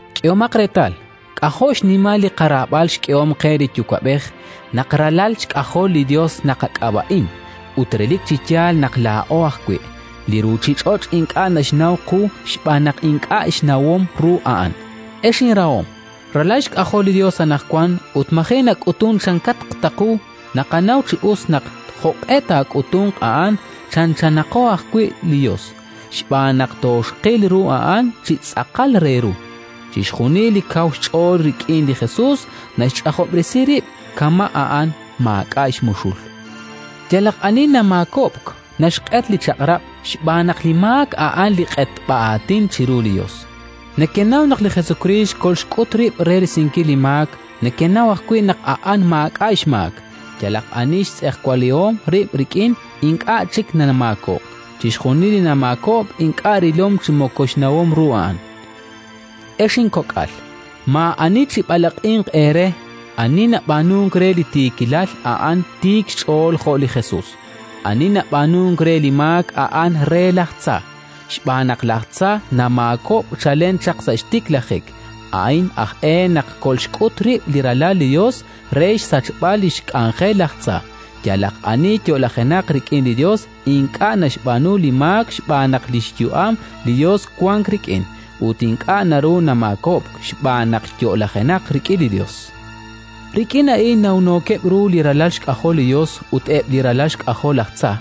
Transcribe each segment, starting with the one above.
K'ehomaq reetal, k'ajo' xnimal li qaraab'al xk'ehom qe li Yuwa'b'ej: naq ralal xk'ajol li Yos naqak'ab'a'in, ut relik chi yaal naq laa'o ajwi'. Li ruuchich'och' ink'a' naxnaw qu xb'aan naq ink'a' xnawom ru A'an. Ex inrahom, ralal xk'ajolo li Yos anaqwan, ut maji' nak'utunk chankaq ta qu. Naqanaw chi us naq, jo'q'e taak'utunq a'an, chanchanaqo ajwi' li Yos, xb'aan naq toxqil ru A'an chi tz'aqal re ru. Chixjunil li kaw xch'ool rik'in li Jesus, naxch'ajob'resi rib', kama' A'an maak'a' xmuxul. Yalaq ani namaakob'k, naxq'et li Chaq'rab', xb'aan naq li maak a'an li q'etb'a-aatin chiru li Yos. Nekenaw naq li Jesukriist kolxk'ut rib' re risinkil li maak; nekenaw ajwi' naq A'an maak'a' xmaak. Yalaq ani xtz'ejwalihom rib' rik'in, ink'a' chik namaakob'k; chixjunil li namaakob'k ink'a' rilom chi moko xnawom ru A'an. Ex inkok'al, maa'ani chib'alaq'inq eere. Ani nab'aanunk re li tiikilal, a'an tiik xch'ool jo' li Jesus. Ani nab'aanunk re li maak a'an re laj tza, xb'aan naq laj tza namaakob'k chalen chaq sa' xtiklajik. A'in aj e naq kolxk'ut rib' li Ralal li Yos, re xsachb'al li xk'anjel laj tza. Yalaq ani yo'lajenaq rik'in li Yos ink'a' naxb'aanu li maak xb'aan naq li xyu'am li Yos wank rik'in; ut ink'a' naru namaakob'k, xb'aan naq yo'lajenaq rik'in li Yos. Rik'in a'in nawnookeb' ru li ralal xk'ajol li Yos ut eb' li ralal xk'ajol laj tza: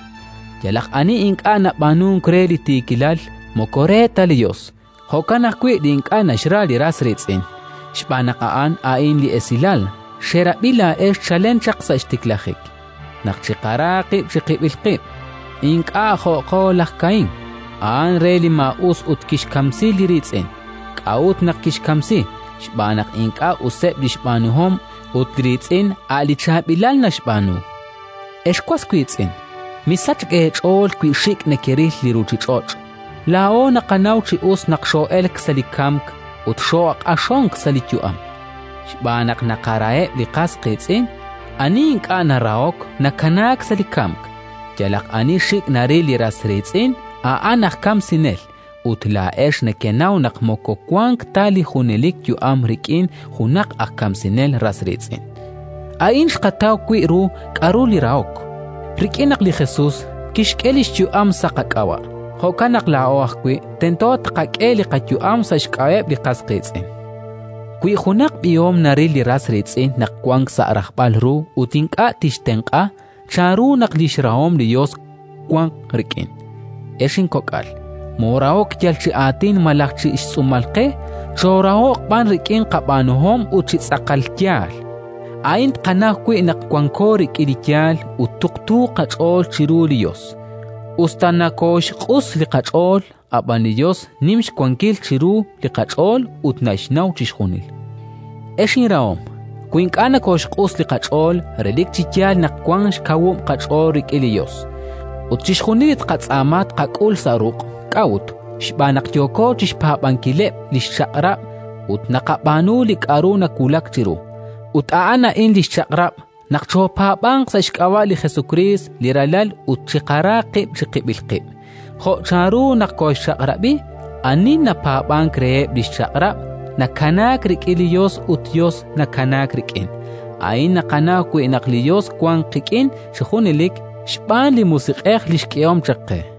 yalaq ani ink'a' nab'aanunk re li tiikilal, moko re ta li Yos; jo'kan ajwi' li ink'a' naxra li ras riitz'in. Xb'aan naq a'an a'in li esilal xerab'i laa'ex chalen chaq sa' xtiklajik: naq chiqara qib' chiqib'il qib'. Ink'a' jo'aqo laj Kaín: a'an re li maa'us ut kixkamsi li riitz'in. K'a'ut naq kixkamsi? Xb'aan naq ink'a' useb' li xb'aanuhom, ut li riitz'in a' li chaab'ilal naxb'aanu. Ex was wiitz'in, misachk eech'ool wi xik' nekexril li ruuchich'och'. Laa'o naqanaw chi us naq xoo'elk sa' li kamk ut xooq'axonk sa' li yu'am, xb'aan naq naqaraheb' li qas qiitz'in. Ani ink'a' narahok, nakanaak sa' li kamk. Yalaq ani xik' naril li ras riitz'in a'an aj kamsinel, ut laa'ex nekenaw naq moko wank ta li junelik yu'am rik'in junaq aj kamsinel ras riitz'in. A'in xqataw wi' ru k'aru li rahok, rik'in naq li Jesus kixk'e li xyu'am sa' qak'ab'a'; jo'kan naq laa'o ajwi' tento tqak'e li qayu'am sa' xk'ab'a'eb' li qas qiitz'in. Wi junaq b'ihom naril li ras riitz'in naq wank sa' rajb'al ru ut ink'a' tixtenq'a, chanru naq li xrahom li Yos wanq rik'in? Ex inkok'al, moorahok yal chi aatin malaj chi xtz'uumal qe, choorahoq b'an rik'in qab'aanuhom ut chi tz'aqal yaal. A'in tqanaw wi' naq wanko rik'in li yaal ut tuqtuuq qach'ool chiru li Yos; us ta nokooxq'us li qach'ool, ab'an li Yos nim xwankil chiru li qach'ool ut naxnaw chixjunil. Ex inrahom, wi ink'a' nokooxq'us li qach'ool, relik chi yaal naq wank xkawub' qach'ool rik'in li Yos, ut chixjunil li tqatz'aama tqak'ul sa' ruq'. K'a'ut? Xb'aan naq yooko chi xpaab'ankileb' li xchaq'rab' ut naqab'aanu li k'aru nawulak chiru. Ut a'an a'in li xchaq'rab': naq choopaab'anq sa' xk'ab'a' li Jesukriist li Ralal ut chiqara qib' chiqib'il qib', jo' chanru naq kooxchaq'rab'i. Ani napaab'ank reheb' li xchaq'rab', nakanaak rik'in li Yos ut li Yos nakanaak rik'in. A'in naqanaw wi' naq li Yos wank qik'in chi junelik: xb'aan li Musiq'ej li xk'ehom chaq qe.